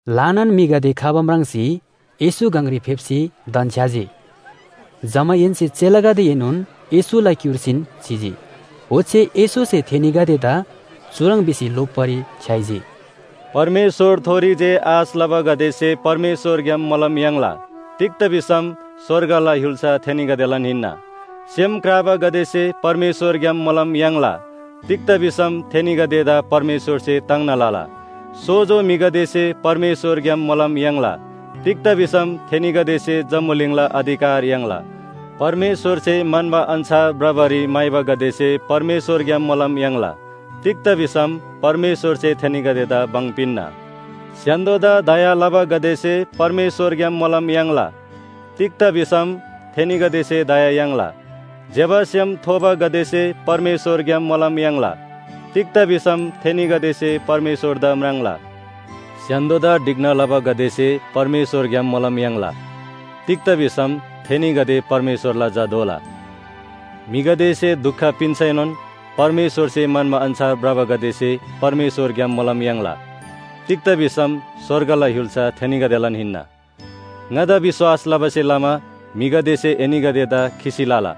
ल्‍हानान म्‍हिगदे खबा म्राङ्सी येशू गङरी फेप्‍सी धन्‍छ्‌याजी। जमाहेन्‍से चेलागदेएनोन येशूला क्‍युर्सीन चिजी। ओच्‍छे येशूसे थेनीगदेदा चुह्रङ् भिसी लोप्‍बारी छ्‌याइजी, “परमेश्‍वरथोरी जे आश लबागदेसे परमेश्‍वरग्‍याम मोलम याङ्ला, तिग्‍दा भिसम स्‍वर्गला य्‍हुल्‍सा थेनीगदेलान हिन्‍ना। सेम क्राबागदेसे परमेश्‍वरग्‍याम मोलम याङ्ला तिग्‍दा भिसम थेनीगदेदा परमेश्‍वरसे ताङ्ना लला। सोजो म्‍हिगदेसे परमेश्‍वरग्‍याम मोलम याङ्ला, तिग्‍दा भिसम थेनीगदेसे जम्‍बुलिङला अधिकार याङ्ला। परमेश्‍वरसे म्‍हन्‍बा अन्‍छार भ्रबारी म्‍हाइबागदेसे परमेश्‍वरग्‍याम मोलम याङ्ला, तिग्‍दा भिसम परमेश्‍वरसे थेनीगदेदा भङ पिन्‍ना। स्‍य्‍हान्‍दोदा दया लबागदेसे परमेश्‍वरग्‍याम मोलम याङ्ला, तिग्‍दा भिसम थेनीगदेसे दया याङ्ला। ज्‍यबा सेम थोबागदेसे परमेश्‍वरग्‍याम मोलम याङ्ला, तिग्‍दा भिसम थेनीगदेसे परमेश्‍वरदा म्राङ्ला। स्‍य्‍हान्‍दोदा ढिक्‍ना लबागदेसे परमेश्‍वरग्‍याम मोलम याङ्ला, तिग्‍दा भिसम थेनीगदे परमेश्‍वरला झा दोला। म्‍हिगदेसे दुख पिन्‍सैनोन परमेश्‍वरसे म्‍हन्‍बा अन्‍छार भ्रबागदेसे परमेश्‍वरग्‍याम मोलम याङ्ला, तिग्‍दा भिसम स्‍वर्गला य्‍हुल्‍सा थेनीगदेलान हिन्‍ना। “ङादा विश्‍वास लबासे लमा म्‍हिगदेसे एनीगदेदा खिसी लला,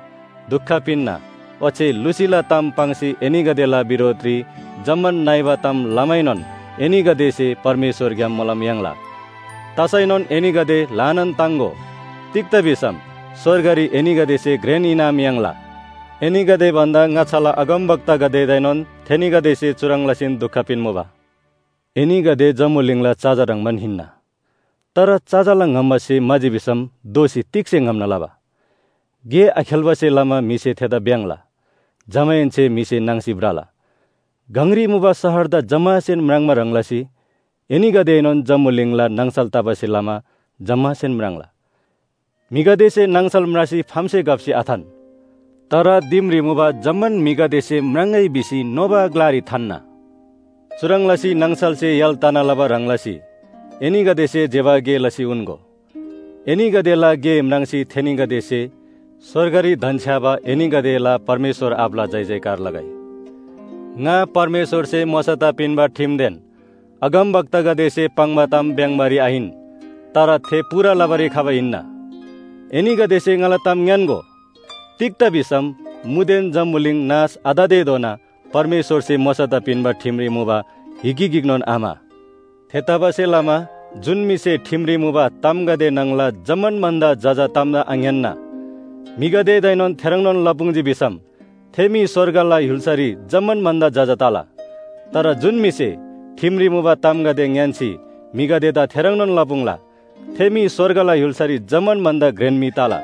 दुख पिन्‍ना, ओच्‍छे लुसीला ताम पाङ्सी एनीगदेला बिरोधरी जम्‍मान नइबा ताम लमैनोन एनीगदेसे परमेश्‍वरग्‍याम मोलम याङ्ला। तसैनोन एनीगदे ल्‍हानान ताङ्‍गो, तिग्‍दा भिसम स्‍वर्गरी एनीगदेसे घ्रेन इनाम याङ्ला। एनीगदे भन्‍दा ङाच्‍छाला अगमवक्तागदेदाएनोन थेनीगदेसे चुह्रङ् लसीन दुख पिन्‍मुबा। “एनीगदे जम्‍बुलिङला चजा ह्रङ्‌बान हिन्‍ना, तर चजाला ङम्‍बा स्‍हे म्‍हाजी भिसम दोःसी तिग्‍से ङम्‍ना लबा? गे आखेल्‍बासे लमा म्‍हिसे थेदा भ्‍याङ्‍ला, जमाहेन्‍से म्‍हिसे नाङ्सी भ्रला। “गङरी मुबा शहरदा जम्‍मासेन म्राङ्बा ह्रङ् लसी एनीगदेएनोन जम्‍बुलिङला नाङसल तबासे लमा जम्‍मासेन म्राङ्ला। म्‍हिगदेसे नाङसल म्रासी फामसे घप्‍सी आथान, तर दिमरी मुबा जम्‍मान म्‍हिगदेसे म्राङ्‍गै भिसी नोबा ग्‍लारी थान्‍ना। चुह्रङ् लसी नाङसलसे य्‍हाल तना लबा ह्रङ् लसी एनीगदेसे ज्‍यबा गे लसी उन्‍गो। एनीगदेला गे म्राङ्सी थेनीगदेसे स्‍वर्गरी धन्‍छ्‌याबा एनीगदेला परमेश्‍वर आबाला जयजयकार लगै। “ङा परमेश्‍वरसे मोशादा पिन्‍बा ठिमदेन अगमवक्तागदेसे पाङ्बा ताम भ्‍याङ्बारी आहिन, तर थे पूरा लबारी खबा हिन्‍ना। एनीगदेसे ङाला ताम ङ्‌यान्‍गो, तिग्‍दा भिसम मुदेन जम्‍बुलिङ नाश आततेधोना परमेश्‍वरसे मोशादा पिन्‍बा ठिमरी मुबा हिगी गिकनोन आम्‍हा। थेतबासेलमा जुन म्‍हिसे ठिमरी मुबा तामगदे न्‍हङला जम्‍मान भन्‍दा जजा तामदा आङ्‌यान्‍ना म्‍हिगदेदाएनोन थेह्रङ्नोन लपुङ्जी भिसम थे म्‍हि स्‍वर्गला य्‍हुल्‍सारी जम्‍मान भन्‍दा जजा तला। तर जुन म्‍हिसे ठिमरी मुबा तामगदे ङ्‌यान्‍सी म्‍हिगदेदा थेह्रङ्नोन लपुङ्ला थे म्‍हि स्‍वर्गला य्‍हुल्‍सारी जम्‍मान भन्‍दा घ्रेन म्‍हि तला।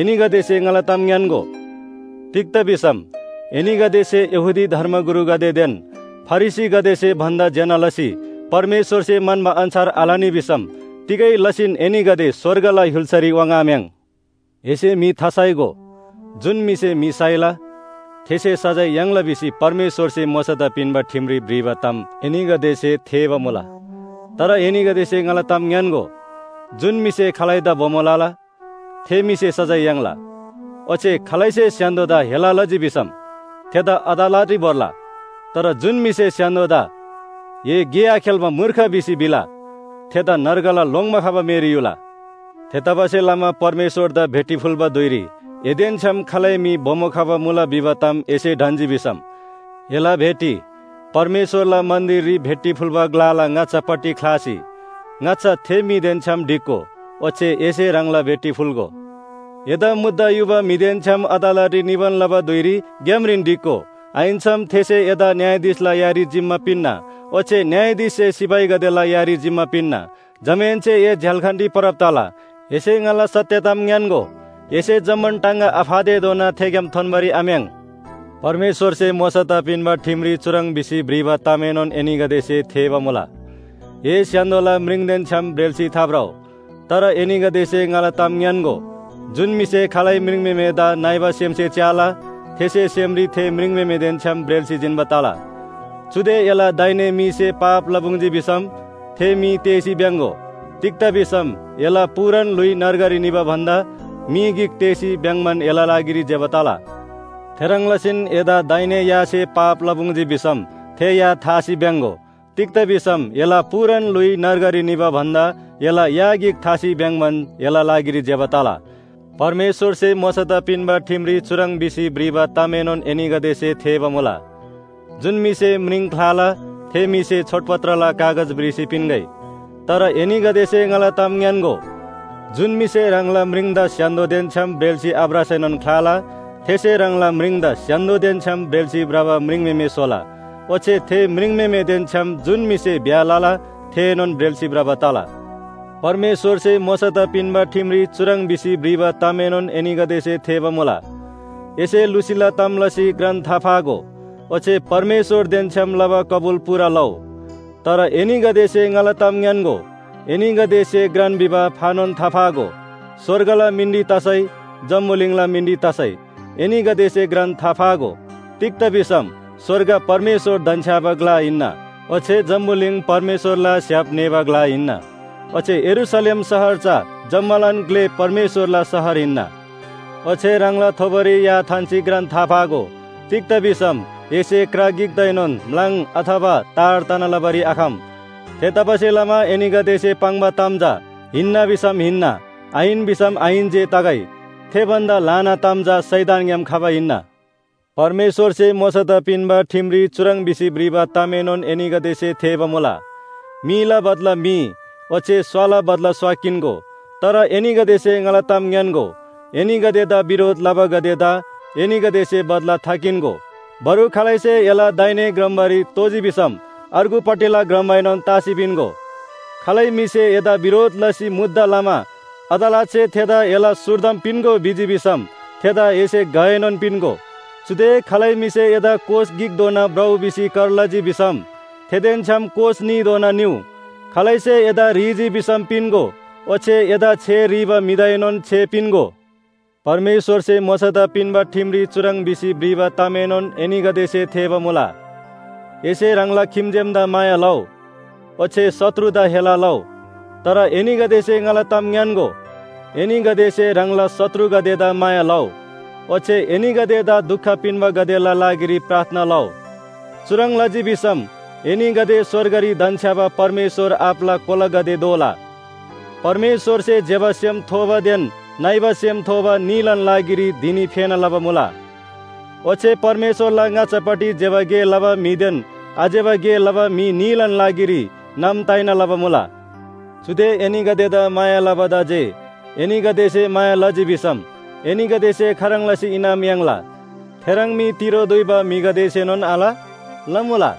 एनीगदेसे ङाला ताम ङ्‌यान्‍गो, तिग्‍दा भिसम एनीगदेसे यहूदी धर्मगुरुगदेदेन फरिसीगदेसे भन्‍दा ज्‍यना लसी परमेश्‍वरसे म्‍हन्‍बा अन्‍छार आलनी भिसम तिगै लसीन एनीगदे स्‍वर्गला य्‍हुल्‍सारी वाङ्‌आम्‍याङ्। “‘एसे म्‍हि थासाइगो, जुन म्‍हिसे म्‍हि साइला थेसे सजाय याङ्ला’ भिसी परमेश्‍वरसे मोशादा पिन्‍बा ठिमरी भ्रिबा ताम एनीगदेसे थेःबा मुला। तर एनीगदेसे ङाला ताम ङ्‌यान्‍गो, जुन म्‍हिसे खालैदा बोमो लला, थे म्‍हिसे सजाय याङ्ला, ओच्‍छे खालैसे स्‍य्‍हान्‍दोदा हेला लजी भिसम थेदा अदालतरी भोर्ला। तर जुन म्‍हिसे स्‍य्‍हान्‍दोदा ‘ए गे आखेल्‍बा मूर्ख’ भिसी भिला थेदा नर्गला लोङ्‌बा खबा मेरी युला। “थेतबासेलमा परमेश्‍वरदा भेटी फुल्‍बा धुइरी एदेन छ्‌याम खालै म्‍हि बोमो खबा मुला भिबा ताम एसे ढन्‍जी भिसम, एला भेटी परमेश्‍वरला मन्‍दिररी भेटी फुल्‍बा ग्‍लाला ङाच्‍छापट्टि ख्‍लासी ङाच्‍छा थे म्‍हिदेन छ्‌याम ढिक्‍गो, ओच्‍छे एसे ह्राङला भेटी फुल्‍गो। “एदा मुद्दा युबा म्‍हिदेन छ्‌याम अदालतरी निबान लबा धुइरी ग्‍यामरीन ढिक्‍गो। आहिन्‍सम थेसे एदा न्‍यायाधीशला यारी जिम्‍मा पिन्‍ना, ओच्‍छे न्‍यायाधीशसे सिपाहीगदेला यारी जिम्‍मा पिन्‍ना। जमाहेन्‍से ए झ्‍याल्‍खानरी परब तला। एसे ङाला सत्‍य ताम ङ्‌यान्‍गो, एसे जम्‍मान टाङगा आफातेधोना थेग्‍याम थोन्‍बारी आम्‍याङ्। “परमेश्‍वरसे मोशादा पिन्‍बा ठिमरी चुह्रङ् भिसी भ्रिबा तामएनोन एनीगदेसे थेःबा मुला, ‘ए स्‍य्‍हान्‍दोला म्रिङदेन छ्‌याम ब्रेल्‍सी थाभ्रउ।’ तर एनीगदेसे ङाला ताम ङ्‌यान्‍गो, जुन म्‍हिसे खालै म्रिङम्‍हेमेदा नइबा सेमसे च्‍याला थेसे सेमरी थे म्रिङम्‍हेमेदेन छ्‌याम ब्रेल्‍सी जिन्‍बा तला। चुदे एला दाहिने मीसे पाप लपुङ्जी भिसम थे मी तेःसी भ्‍याङ्‍गो। तिग्‍दा भिसम एला पूरान ल्‍हुइ नर्गरी निबा भन्‍दा मी गिक तेःसी भ्‍याङ्‍बान एला लागिरी ज्‍यबा तला। थेह्रङ् लसीन एदा दाहिने यासे पाप लपुङ्जी भिसम थे या थासी भ्‍याङ्‍गो। तिग्‍दा भिसम एला पूरान ल्‍हुइ नर्गरी निबा भन्‍दा एला या गिक थासी भ्‍याङ्‍बान एला लागिरी ज्‍यबा तला। “परमेश्‍वरसे मोशादा पिन्‍बा ठिमरी चुह्रङ् भिसी भ्रिबा तामएनोन एनीगदेसे थेःबा मुला, ‘जुन म्‍हिसे म्रिङ ख्‍लाला थे म्‍हिसे छोडपत्रला कागज भ्रिसी पिन्‍गै।’ तर एनीगदेसे ङाला ताम ङ्‌यान्‍गो, जुन म्‍हिसे ह्राङला म्रिङदा स्‍य्‍हान्‍दोदेन छ्‌याम ब्रेल्‍सी आभ्रसैनोन ख्‍लाला, थेसे ह्राङला म्रिङदा स्‍य्‍हान्‍दोदेन छ्‌याम ब्रेल्‍सी भ्रबा म्रिङम्‍हेमे स्‍होला। ओच्‍छे थे म्रिङम्‍हेमेदेन छ्‌याम जुन म्‍हिसे ब्‍याह लला थेएनोन ब्रेल्‍सी भ्रबा तला। “परमेश्‍वरसे मोशादा पिन्‍बा ठिमरी चुह्रङ् भिसी भ्रिबा तामएनोन एनीगदेसे थेःबा मुला, ‘एसे लुसीला ताम लसी घ्रान थाफागो, ओच्‍छे परमेश्‍वरदेन छ्‌याम लबा कबुल पूरा लउ।’ तर एनीगदेसे ङाला ताम ङ्‌यान्‍गो, एनीगदेसे घ्रान भिबा फानोन थाफागो, स्‍वर्गला मिनरी तसै, जम्‍बुलिङला मिनरी तसै एनीगदेसे घ्रान थाफागो। तिग्‍दा भिसम स्‍वर्ग परमेश्‍वर धन्‍छ्‌याबा ग्‍ला हिन्‍ना ओच्‍छे जम्‍बुलिङ परमेश्‍वरला स्‍य्‍हाप न्‍हेःबा ग्‍ला हिन्‍ना, ओच्‍छे यरूशलेम शहर चा जम्‍मालान ग्‍ले परमेश्‍वरला शहर हिन्‍ना। ओच्‍छे ह्राङला थोबोरी या थान्‍सी घ्रान थाफागो। तिग्‍दा भिसम एसे क्रा गिकदाएनोन म्‍लाङ अथवा तार तना लबारी आखम। थेतबासेलमा एनीगदेसे पाङ्बा ताम चा ‘हिन्‍ना’ भिसम ‘हिन्‍ना,’ ‘आहिन’ भिसम ‘आहिन’ जे तगै। थे भन्‍दा ल्‍हाना ताम चा शैतानग्‍याम खबा हिन्‍ना। “परमेश्‍वरसे मोशादा पिन्‍बा ठिमरी चुह्रङ् भिसी भ्रिबा तामएनोन एनीगदेसे थेःबा मुला, ‘मीला बदला मी, ओच्‍छे स्‍वाला बदला स्‍वा किन्‍गो।’ तर एनीगदेसे ङाला ताम ङ्‌यान्‍गो, एनीगदेदा बिरोध लबागदेदा एनीगदेसे बदला थाकिन्‍गो। बरु खालैसे एला दाहिने ग्रम्‍बारी तोजी भिसम अर्गुपट्टिला ग्रम्‍बाएनोन तासी पिन्‍गो। खालै म्‍हिसे एदा बिरोध लसी मुद्दा लमा अदालतसे थेदा एला स्‍हुर्दम पिन्‍गो भिजी भिसम थेदा एसे घएनोन पिन्‍गो। चुदे खालै म्‍हिसे एदा कोस गिकधोना भ्रउ भिसी कर लजी भिसम थेदेन छ्‌याम कोस न्‍हीधोना निउ। खालैसे एदा ह्रीजी भिसम पिन्‍गो ओच्‍छे एदा छे ह्रीबा म्‍हिदाएनोन छे पिन्‍गो। “परमेश्‍वरसे मोशादा पिन्‍बा ठिमरी चुह्रङ् भिसी भ्रिबा तामएनोन एनीगदेसे थेःबा मुला, ‘एसे ह्राङला खिम्‍जेमदा माया लउ, ओच्‍छे शत्रुदा हेला लउ।’ तर एनीगदेसे ङाला ताम ङ्‌यान्‍गो, एनीगदेसे ह्राङला शत्रुगदेदा माया लउ, ओच्‍छे एनीगदेदा दुख पिन्‍बागदेला लागिरी प्रार्थना लउ। चुह्रङ् लजी भिसम एनीगदे स्‍वर्गरी धन्‍छ्‌याबा परमेश्‍वर आबाला कोलागदे दोला। परमेश्‍वरसे ज्‍यबा सेम थोबादेन नइबा सेम थोबा न्‍हीलान लागिरी धिनी फेना लबा मुला। ओच्‍छे परमेश्‍वरला ङाच्‍छापट्टि ज्‍यबा गे लबा म्‍हिदेन आज्‍यबा गे लबा म्‍हि न्‍हीलान लागिरी नाम ताइना लबा मुला। चुदे एनीगदेदा माया लबादा जे एनीगदेसे माया लजी भिसम एनीगदेसे खाह्रङ् लसी इनाम याङ्ला? थेह्रङ् मी तिरो दुइबा म्‍हिगदेसेनोन आल? लमुला।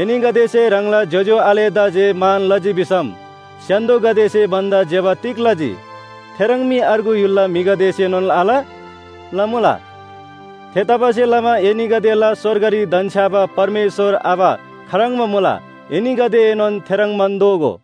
एनीगदेसे ह्राङला ज्‍योज्‍यो आलेगदेदा जे मान लजी भिसम स्‍य्‍हान्‍दोगदेसे भन्‍दा ज्‍यबा तिग लजी? थेह्रङ् मी अर्गु य्‍हुलला म्‍हिगदेसेनोन आल? लमुला। थेतबासेलमा एनीगदेला स्‍वर्गरी धन्‍छ्‌याबा परमेश्‍वर आबा खाह्रङ्बा मुला, एनीगदेएनोन थेह्रङ्बान दोगो।”